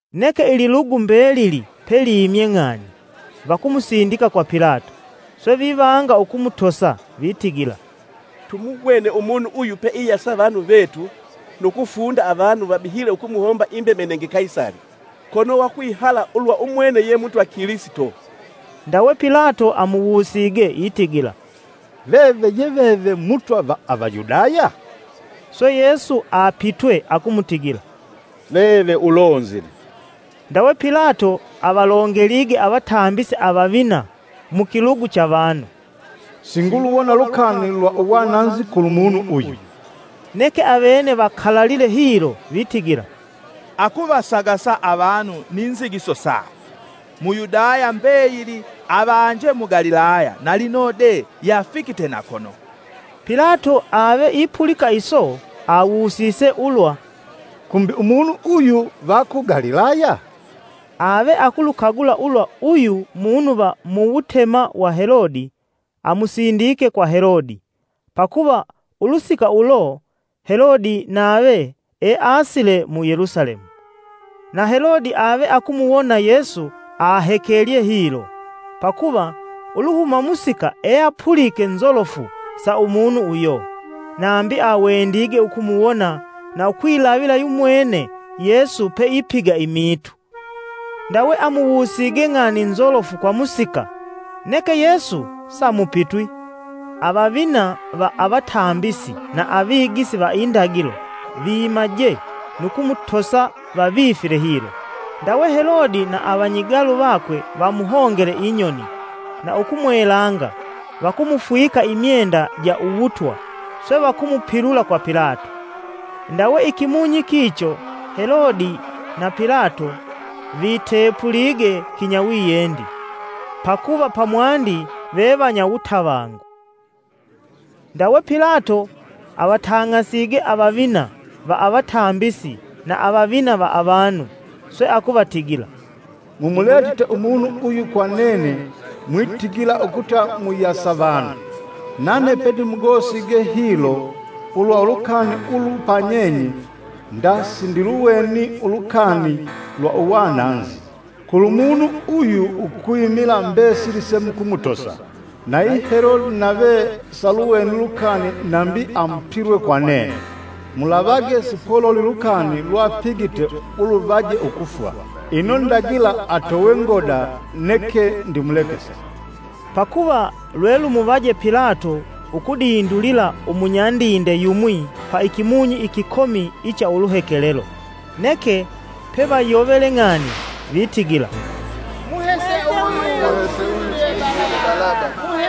Neke ililugu mbelili pelimye ng'ani, vakumusindika kwa Pilato. Swe vivanga ukumutosa: vitigila, “Tumuwene umunu uyu peiyasa avanu vetu, nu kufunda avanu vabihile ukumuhomba imbemenenge Kaisali, kono we akwihala ulwa umwene ye Mutwa Kilisito.” Ndawe Pilato amuwusige itigila, “Veve ye veve Mutwa va Avayudaya?” Swe Yesu apitwe akumutigila, “Veve ulonzile.” Ndawe Pilato avalongelige avatambisi avavina mukilugu cha vanu, “Singuluwona lukani lwa uwananzi kulu munu uyu.” Neke avene vakalalile hilo vitigila, “Akuvasagasa avanu ni nzigiso sakwe, mu Yudaya mbeyili avanje mu Galilaya na lino de yeafikite na kono.” Pilato ave ipulika iso, awusise ulwa “Kumbi umunu uyu va ku Galilaya?” Ave akulukagula ulwa uyu munu va muwutema wa Helodi, amusindike kwa Helodi; pakuva ulusika ulo Helodi nave easile mu Yelusalemu. Na Helodi ave akumuwona Yesu ahekelye hilo, pakuva uluhuma musika eapulike nzolofu sa umunu uyo, nambi awendige ukumuwona na ukwilavila yumwene Yesu peipiga imiitu. Ndawe amuwusige ng'ani nzolofu kwa musika, neke Yesu samupitwi. Avavina va avatambisi na avigisi va Indagilo vimaje nu kumutosa vavifile hilo. Ndawe Helodi na avanyigalu vakwe vamuhongele inyoni, na ukumwelanga vakumufwika imyenda ja Uwutwa, swe vakumupilula kwa Pilato. Ndawe ikimunyi kicho Helodi na Pilato vitepulige kinyawiyendi, pakuva pamwandi vevanya wutavangu. Ndawe Pilato avatang'asige avavina va avatambisi na avavina va avanu, swe akuvatigila, “Mumuletite umunu uyu kwa nene mwitigila ukuta muyasa vanu; nane pendimugosige hilo ulwa ulukani ulu panyenye, nda sindiluweni ulukani lwa uwananzi, kulumunu uyu ukwimila mbesili semukumutosa. Na yi Helodi nave saluweni lukani nambi amupilwe kwa nene. Mulavage sipololi lukani lwapigite uluvaje ukufwa. Ino ndagila atowe ngoda neke ndimulekese.” [ Pakuva lwe lumuvaje Pilato ukudindulila umunyandinde yumwi pa ikimunyi ikikomi icha uluhekelelo.] Neke pevayovele ng'ani vitigila, “Muhese uyu tudindulile Balaba!” (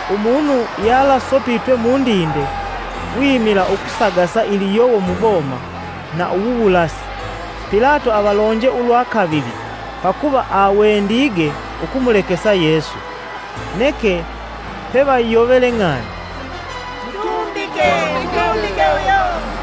Umunu yalasopitwe mundinde wimila ukusagasa iliyowo muboma, na uwuwulasi.) Pilato avalonje ulwa kavili pakuva awendige ukumulekesa Yesu; neke pevayovele ng'ani, “Mutumbike, mutumbike uyo!”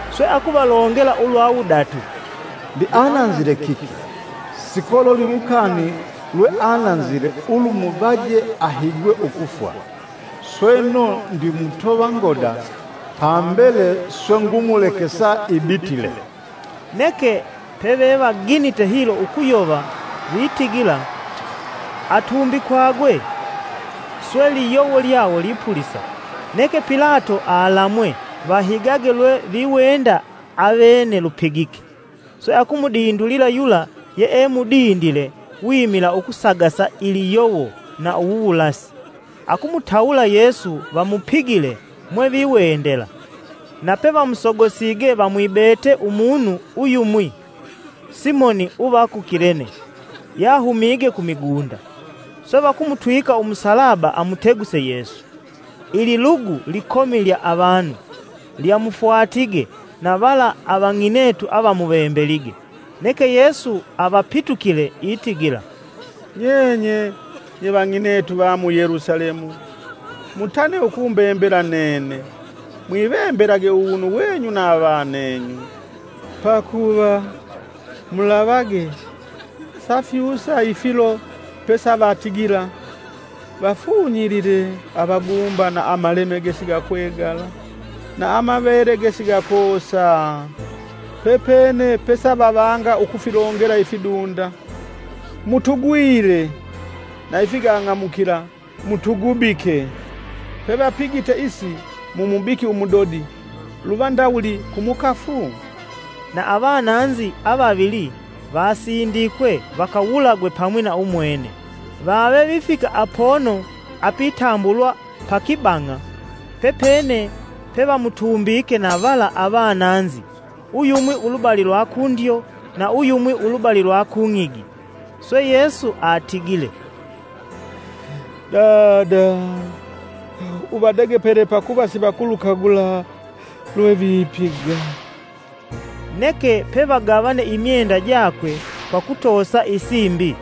Swe akuvalongela ulwa wudatu, “Mbi ananzile kiki? Sikololi lukani lweananzile ulumuvaje ahigwe ukufwa, sweno ndimutova ngoda, pambele swe ngumulekesa ibitile.” Neke pevevaginite hilo ukuyova vitigila, atumbikwagwe. Swe liyowo lyawo lipulisa. Neke Pilato alamwe vahigage lwe viwenda avene lupigike. Swe akumudindulila yula yeemudindile wimila ukusagasa iliyowo na uwuwulasi, akumutawula Yesu vamupigile mwe viwendela. Na pevamusogosige vamwibete umunu uyumwi Simoni uva ku Kilene yahumige ku migunda, swe vakumutwika umusalaba amuteguse Yesu. Ililugu likomi lya avanu lyamufwatige na vala avang'inetu avamuvembelige. Neke Yesu avapitukile itigila, “Nyenye nye vang'inetu va mu Yelusalemu! Mutane ukumbembela nene, mwivembelage uwunu wenyu na avanenyu. Pakuva, mulavage, safyusa ifilo pesavatigila: ‘Vafunyilile avaguumba na amaleme gesigakwegala, na amavele gesigakoosa!’ Pepene pesavavanga ukufilongela ifidunda: ‘Mutugwile!’ na ifigang'amukila, ‘Mutugubike!’ Pevapigite isi mumubiki umudodi luva ndawuli ku mukafu?” Na avananzi avavili vasindikwe vakawulagwe pamwi na umwene. Vave vifika apono apitambulwa pa kibang'a, pepene pevamutumbike na vala avananzi uyumwi ulubali lwa kundyo na uyumwi ulubali lwa kung'igi. Swe Yesu atigile, “Dada, uvadegepele pakuva sivakulugula lwe vipiga.” Neke pevagavane imyenda jakwe kwa kutoosa isimbi.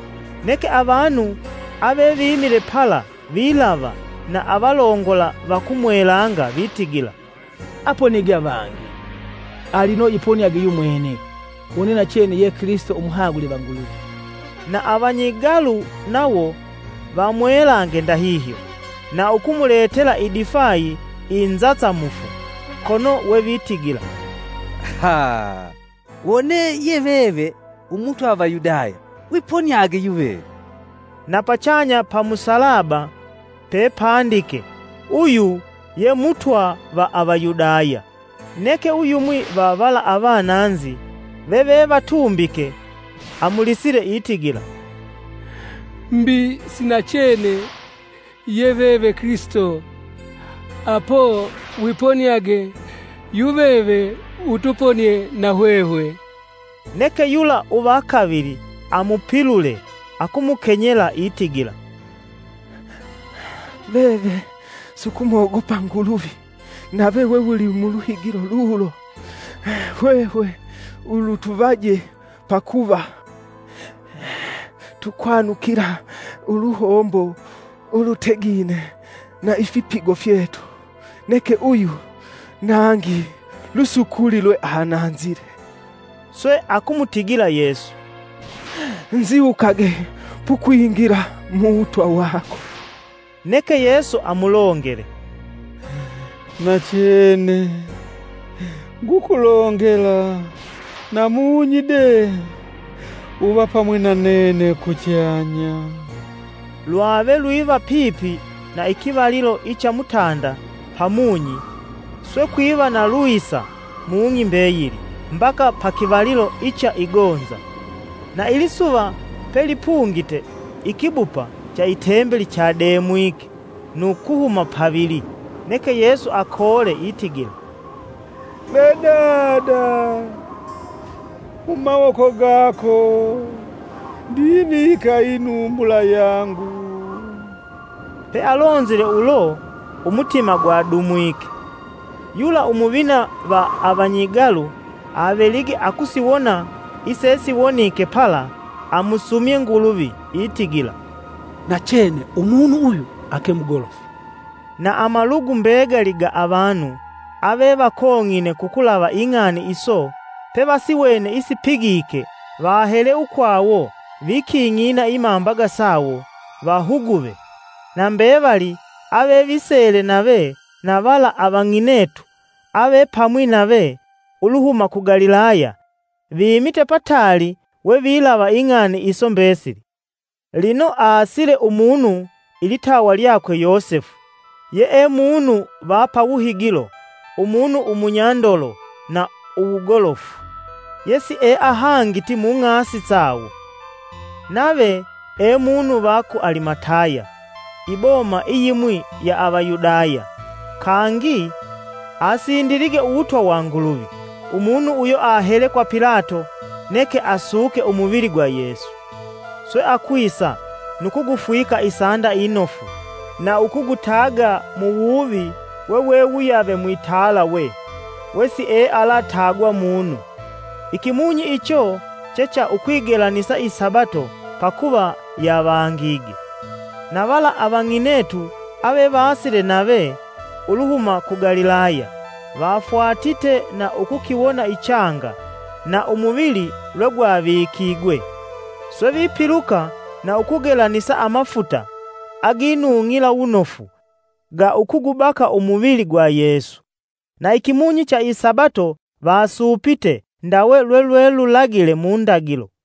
Neke avanu avevimile pala vilava na avalongola vakumwelanga vitigila, “Aponige avangi, ali lino iponiage yumwene, wone nachene ye Kilisito umuhagule va Nguluvi!” Na avanyigalu nawo vamwelange ndahihyo: na ukumuletela idifayi inzasamufu, kono wevitigila, “Wone veve ye veve mutwa va Avayudaya wiponiage yuveve.” Na pachanya pa musalaba pepandike, “Uyu ye Mutwa va Avayudaya.” Neke Uyumwi va vala avananzi, veve vatumbike amulisile itigila: “Mbi si nachene ye veve Kilisito? Apo wiponiage yuveve utuponie na hwehwe.” Neke yula uva kavili amupilule, akumukenyela itigila, “Veve sukumwogopa Nguluvi, nave wewuli muluhigilo lulo? Hwehwe ulu lutuvaje pakuva tukwanukila uluhombo ulutegine na ifipigo fyetu neke uyu nangi lusukuli lweananzile.” Swe akumutigila Yesu, “Nziwukage pukwingila mu wutwa wako.” Neke Yesu amulongele, “Nachene, ngukulongela namunyi de uva pamwi na nene kuchanya.” Lwave lwiva pipi na ikivalilo icha mutanda pamunyi, swe kwiva na lwisa mung'i mbeyili mbaka pa kivalilo icha igonza, na ilisuva pelipungite ikibupa cha itembeli chademwike nu kuhuma pavili. Neke Yesu, akoole itigila ve Dada, mumawoko gako ndivika inumbula yangu.” Pealonzile ulo umutima gwadumwike. Yula umuvina va avanyigalu avelige akusiwona isesiwonike pala, amusumye Nguluvi itigila, “Nachene umunu uyu ake mugolofu.” Na amalugu mbegali ga avanu avevakong'ine kukulava ing'ani iso pevasiwene isipigike vahele ukwawo viking'ina imambaga sawo vahuguve. Na mbevali avevisele nave, na vala avang'inetu avepamwi nave, uluhuma ku Galilaya, vimite pataali we vilava ing'ani iso mbesili. Lino aasile umunu ilitawa lyakwe Yosefu yee munu va pa wuhigilo umunu umunyandolo na uwugolofu, ( yesieahangiti mung'asi sawo) nave e munu va ku Alimataya; iboma iyimwi ya Avayudaya kangi asindilige uwutwa wa Nguluvi. Umunu uyo ahele kwa Pilato neke asuke umuvili gwa Yesu. Swe akwisa nu kugufwika isanda inofu na ukugutaga muwuvi wewe wuyave mwitalawe mwesiealatagwa munu. Ikimunyi icho che cha ukwigelanisa isabato pakuva yavangige. Na vala avang'inetu avevasile nave, uluhuma ku Galilaya, vafwatite na ukukiwona ichanga, na umuvili lwe gwavikigwe. Swe vipiluka, na ukugelanisa amafuta aginung'ila wunofu ga ukugubaka umuvili gwa Yesu. Na ikimunyi cha isabato vasuupite ndawe lwelwelulagile mu ndagilo.